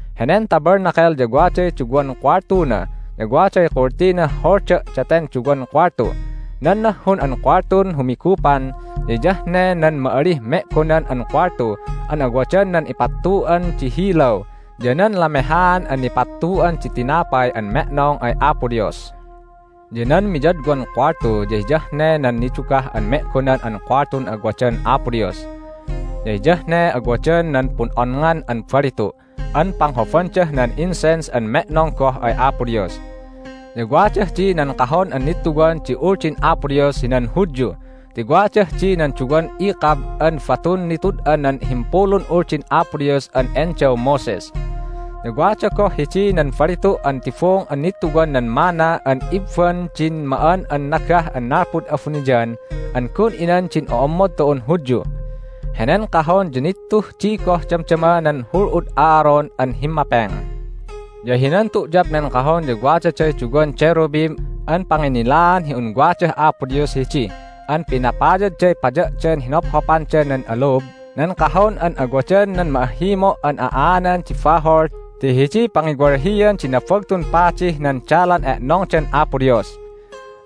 Henen Tabernacle ya waday duwan kuwaltuna, ya waday kultinah holda' daten duwan kuwaltu. Nan nahhun an kuwaltun humigupan ya hiyah ne nan ma'alih Me'gonan an Kuwaltu an awadan nan ipattu'an di hilaw ya nan lamehaan an nipattu'an di tinapay an me'nong ay Apo Dios. Ya nan miyadwan kuwaltu ya hiyah ne nan Nidugah an Me'gonan an Kuwaltun awadan Apo Dios. Ya hiyah ne awadan nan pun'onngan an balitu' an panghobandah nan incense an me'nong goh ay Apo Dios. Ya wadah di nan Kahon an Nittuwan di Uldin Apo Dios hinan Hudyu ti wadah di nan duwan ikab an batun nitud'an nan Himpulun Uldin Apo Dios an endaw Moses. Ya wada goh hidi nan balitu' an tibung an nittuwan nan manna an ibban din ma'an an nagah an nalpud abuniyan an gun inan din o'ommod tu'un Hudyu. Henen Kahon ya nittuh di goh damdama nan hul'ud Aaron an himmapeng. Ya hinan tu'yap nen Kahon ya wadaday duwan cherubim an panginnilaan hi un wadah Apo Dios hidi an pinapayadday paya'dan hinophopanda nan alub nan Kahon an awadan nan Ma'ahhimo' an a'aanan di bahol ti hidiy pangiwalhian di Nabagtun Padih nan dalan e'nongdan Apo Dios.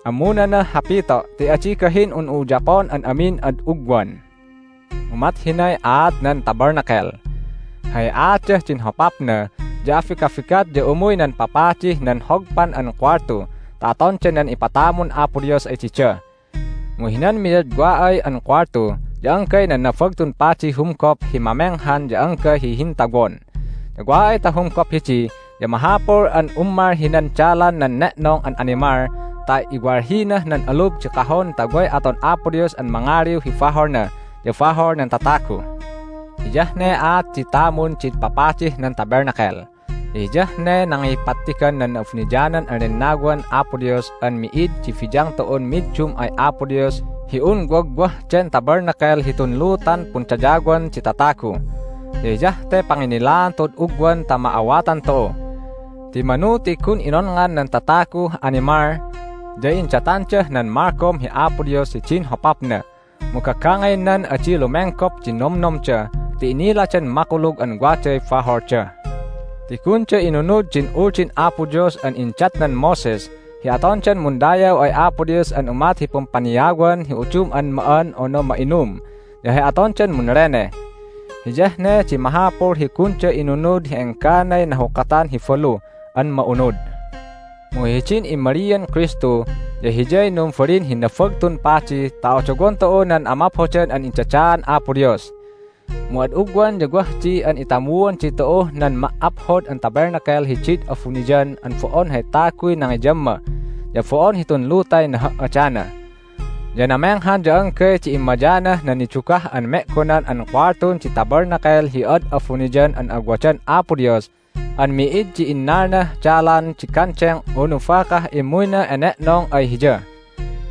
Ammunanah hapito' ti adi gahin hi un'u uyapon an amin ad ugwan. Umat hinay aat nan Tabernacle. Hay aatdah din hopapna ya abigabigat ya umuy nan papadih nan hogpan an kuwaltu ta atonda nan ipatamun Apo Dios ay dida. Mu hinan miyadwa ay an kuwaltu ya anggay nan Nabagtun Padiy humgop hi mamenghan ya anggay hi hintawon. Ya wa ay ta humgop hidi ya mahapul an ummal hinan dalan nan ne'nong an animal ta iwalhinah nan alub din Kahon ta way aton Apo Dios an mangaliw hi baholna ya bahol nan tatagu. Hiyah ne aat di tamun din papadih nan Tabernacle, ya hiyah ne nangipattigan nan Na'abuniyanan an Lennawan Apo Dios an mi'id di biyang tu'un middum ay Apo Dios hi un wagwah den Tabernacle hitun lutan pundayawan di tatagu. Ya hiyah te panginnilaan tu'ud ugwan ta ma'awatan tu'u. Ti manu ti gun inonngan nan tataguh animal, ya indatandah nan malgom hi Apo Dios hidin hopapna, mu gagangaynan adi lumenggop di nomnomda ti iniladan makulug an waday baholda. Ti gunda inunud din Uldin Apo Dios an indatnan Moses hi atondan mundayaw ay Apo Dios an umat hi pumpaniawan hi udum an ma'an unu ma'inum ya hay atondan munleneh. Hiyah ne di mahapul hi gunda inunud hi engganay nahukatan hi balu an ma'unud. Mu hidin immalian Kristu ya Hiyay numbalin hi Nabagtun Padi ta odowon tu'u nan amaphodan an indadaan Apo Dios. Mu ad ugwan ya wah di an itamuan ditu'uh nan ma"aphod an Tabernacle hidid abuniyan an bo'on hay taguy nangiyamma, ya bo'on hitun lutay naha"adana. Ya namenghan ya anggay di immayanah nan Nidugah an Me'gonan an Kuwaltun di Tabernacle hi ad abuniyan an awadan Apo Dios an mi'id di innalnah dalan di gandeng unu bakah immuyna ene'nong ay Hiya.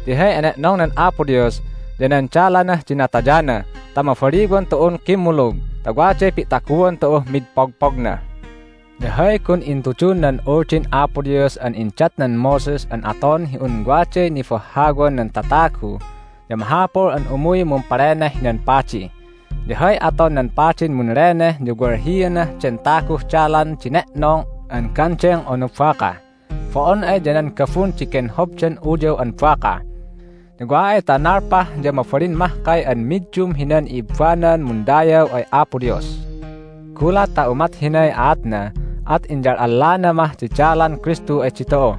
Ti hay ene'nongnan Apo Dios ya nan dalanah din natayana ta mabaliwan tu'un kimmulug ta waday pi'taguan tu'uh mid pogpogna. Ya hay gun intudun nan Uldin Apo Dios an indatnan Moses an aton hi un waday nibahhawan nan tatagu ya mahapul an umuy mumpaleneh hinan padi. Ya hay aton nan padin munleneh ya walhianah den taguh dalan di ne'nong an gandeng unu baka. Bo'on ay ya nan gabun di genhobdan uyaw an baka. Ya wa ay ta nalpah ya mabalin mahkay an middum hinan i'ibbanan mundayaw ay Apo Dios. Gulat ta umat hinay aatna at inyal'allana mah di dalan Kristu ay ditu'u!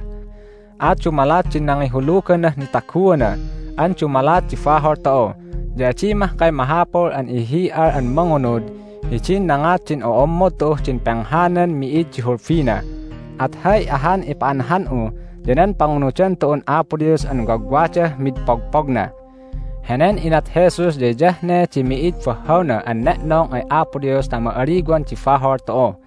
At dumalat di nangihuluganah nitaguana an dumalat di bahol tu'u ya adi mahkay mahapul an ihihi'al an mangunud hidin nangat din o'ommod tu'uh din penghanan mi'id di hulbina, at hay ahan ipa'anhan'u ya nan pangunudan tu'un Apo Dios an wagwadah mid pogpogna. Henen inat Jesus ya hiyah ne di mi'id bahhawna an ne'nong ay Apo Dios ta ma'aliwan di bahol tu'u.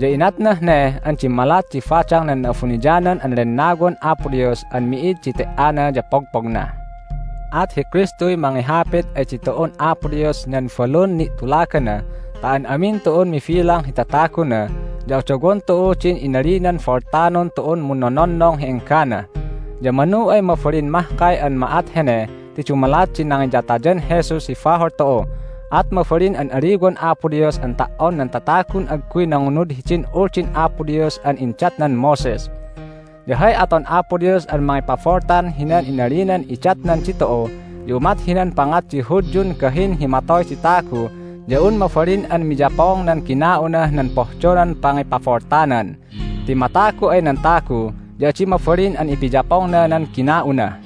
Ya inatnah ne an dimmalat di badang nan Na'abuniyanan an Lennawan Apo Dios an mi'id di te"ana ya pogpogna. At hi Kristuy mangihapit ay ditu'un Apo Dios hinan balun ni'tulagana ta an amin tu'un mibilang hi tataguna ya odowon tu'u din inalinan boltanon tu'un munnononnong hi enggana. Ya manu ay mabalin mahkay an ma'at hene ti dumalat di nangiyatayan Jesus hi bahol tu'u, at mabalin an aliwan Apo Dios an ta"on nan tatagun agguy nangunud hidin Uldin Apo Dios an indatnan Moses. Ya hay aton Apo Dios an mangipaboltan hinan inalinan idatnan ditu'u ya umat hinan pangat di Hudyun gahin hi matoy di tagu ya un mabalin an miyapong nan gina'unah nan pohdonan pangipaboltanan. Ti matagu ay nan tagu ya adi mabalin an ipiyapongna nan gina'una.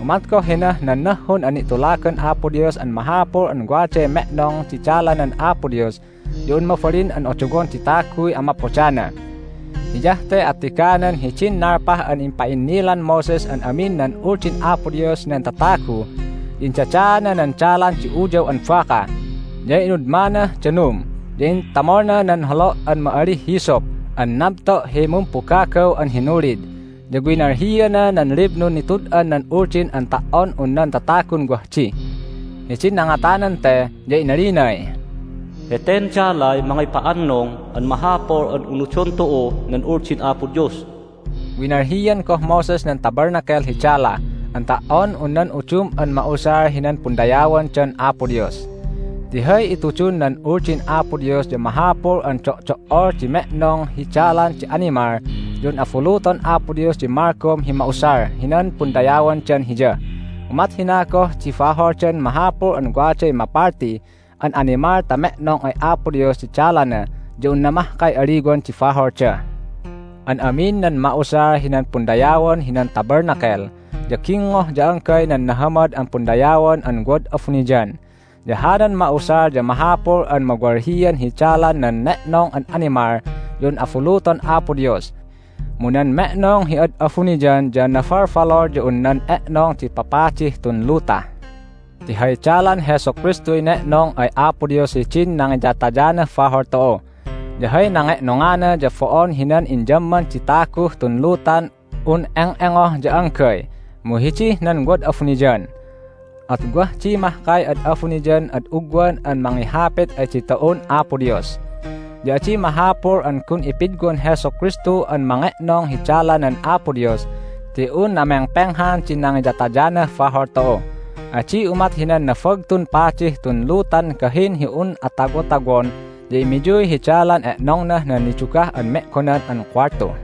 Umat goh hinah nan nahhun an ni'tulagan Apo Dios an mahapul un waday me'nong di dalanan Apo Dios ya un mabalin an odowon di taguy amaphodana. Hiyah te attiganan hidin nalpah an impa'innilan Moses an amin nan Uldin Apo Dios hinan tatagu ya indadaana nan dalan di uyaw an baka, ya inudmanah danum, ya intamolna nan holo' an ma'alih hyssop an nabto' hi mumpugagaw an hinulid, ya winalhiana nan liblun nitud'an nan Uldin an ta"on un nan tatagun wah di. Hidin nangatanan te ya inalinay, "Heten dalay mangipa'annung an mahapul an unudon tu'u nan Uldin Apo Dios." Winalhian goh Moses nan Tabernacle hi dala an ta"on un nan udum an ma'usal hinan pundayawandan Apo Dios. Ti hay itudun nan Uldin Apo Dios ya mahapul an do'do'ol di me'nong hi dalan di animal ya un abuluton Apo Dios di malgom hi ma'usal hinan pundayawandan Hiya. Umat hina goh hi baholdan mahapul an waday mapalti an animal ta me'nong ay Apo Dios di dalana ya unna mahkay aliwan di baholda. An amin nan ma'usal hinan pundayawan hinan Tabernacle ya gingngoh ya anggay nan nahamad an pundayawan an wad abuniyan. Ya hanan ma'usal ya mahapul an mawalhian hi dalan nan ne'nong an animal ya un abuluton Apo Dios. Mu nan me'nong hi ad abuniyan ya nabalbalul ya un nan e'nong di papadih tun luta ti hay dalan Jesu Kristuy ne'nong ay Apo Dios hidin nangiyatayanah bahol tu'u. Ya hay nange'nongana ya bo'on hinan inyamman di taguh tun lutan un eng'engoh ya anggay, mu hidih nan wad abuniyan. At wah di mahkay ad abuniyan ad ugwan an mangihapit ay ditu'un Apo Dios. Ya adi mahapul an gun ipidwan Jesu Kristu an mange'nong hi dalanan Apo Dios ti un namengpenghan di nangiyatayanah bahol tu'u. Adi umat hinan Nabagtun Padih tun lutan gahin hi un atawotawon ya immiyuy hi dalan e'nongnah nan Nidugah an Me'gonan an Kuwaltu